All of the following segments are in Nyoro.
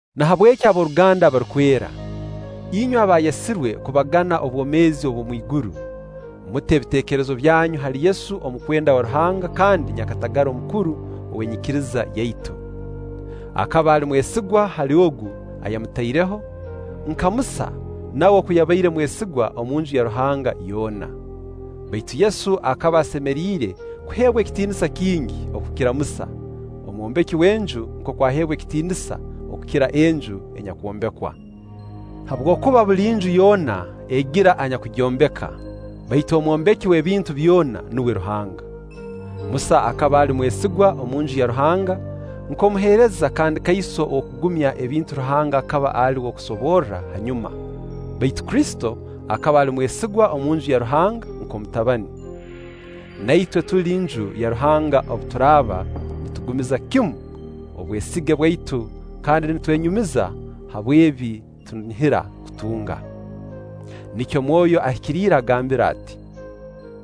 Nahabweki ab'oruganda abarukwera, inywe abaayesirwe kubagana obwomeezi obw'omwiguru, mute ebiteekerezo byanyu hali Yesu omukwenda wa Ruhanga kandi nyakatagara omukuru ow'enyikiriza yaitu. Akaba ali mwesigwa hali Ogu ayamutaireho, nka Musa nawe oku yabaire mwesigwa omunju ya Ruhanga yoona. Baitu Yesu akaba asemeriire kuheebwa ekitiinisa kingi okukira Musa, omwombeki w'enju nkooku aheebwa akitiinisa okukira enju enyakwombekwa. ( Habwokuba buli nju yoona egira anyakugyombeka, baitu omwombeki w'ebintu byona nuwe Ruhanga.) Musa akaba ali mwesigwa omu nju ya Ruhanga nk'omuheereza kandi kaiso w'okugumya ebintu Ruhanga akaba ali w'okusoborra hanyuma; baitu Kristo akaba ali mwesigwa omunju ya Ruhanga nk'omutabani. Na itwe tuli nju ya Ruhanga obu turaaba nitugumiza kimu obwesige bwaitu kandi nitwenyumiza habw'ebi tunihira kutunga. Nikyo Mwoyo Ahikiriire yagambiire ati: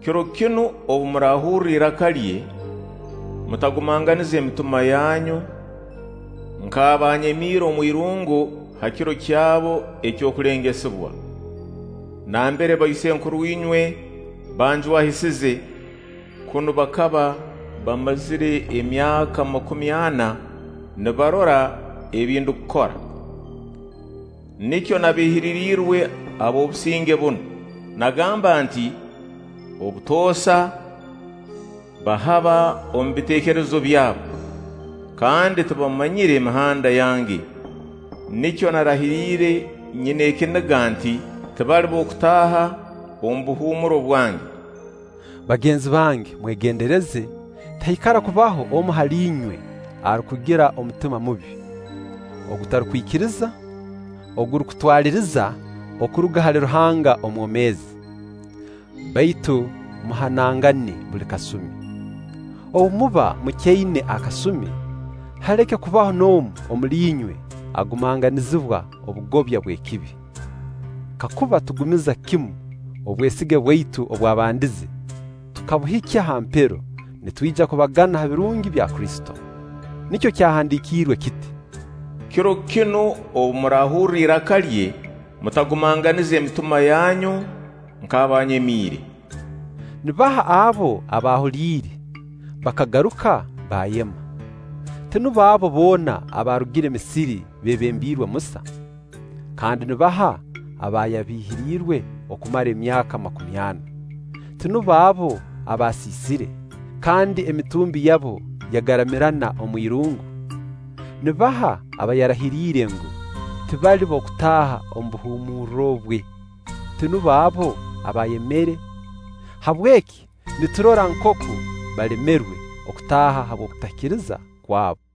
“Kiro kinu obu murahurra iraka lye, mutagumanganiza emitima yanyu nk'abaanyemiire omwirungu ha kiro kyabo eky'okulengesibwa, nambere baisenkuru inywe baanjwahisize, kunu bakaba bamazire emyaka makumi ana nibarora ebi ndukukora. Nikyo nabiihiriirwe ab'obusinge bunu, nagamba nti: ‘Obutoosa bahaba omu biteekerezo byabo; kandi tibamanyire mihanda yange’ Nikyo narahiriire nyina ekiniga nti: ‘Tibali b'okutaaha omu buhuumuro bwange.’” Bagenzi bange mwegendereze, tihaikara kubaho omu omuli inywe arukugira omutima mubi, ogutarukwikiriza, ogurukutwaliriza okuruga hali Ruhanga omwomeezi. Baitu muhanangane buli kasumi. Obu muba mukyaina “akasumi”, haleke kubaho n'omu omuli inywe agumanganizibwa obugobya bw'ekibi. Kakuba tugumiza kimu obwesige bwaitu obwabandize, tukabuhikya ha mpero, nitwija kubagana ha birungi bya Kristo. Nikyo kyahandiikiirwe kiti: “Kiro kinu obu murahurra iraka lye, mutagumanganiza emitima yanyu nk'abaanyemiire.” Nibaha abo abaahuliire, bakagaruka baayema? Tinubo abo boona abaarugire Misiri beebembiirwe Musa? Kandi nibaha aba yabiihiriirwe okumara emyaka makumi ana? Tinubo abo abasiisire, kandi emitumbi yabo yagaramirana omwirungi? Nibaha aba yarahiriire ngu, tibali b'okutaaha omu buhuumuro bwe? Tinubo abo abaayemere? Habweki niturora nkooku baalemerwe kutaaha habw'okutaikiriza kwabo.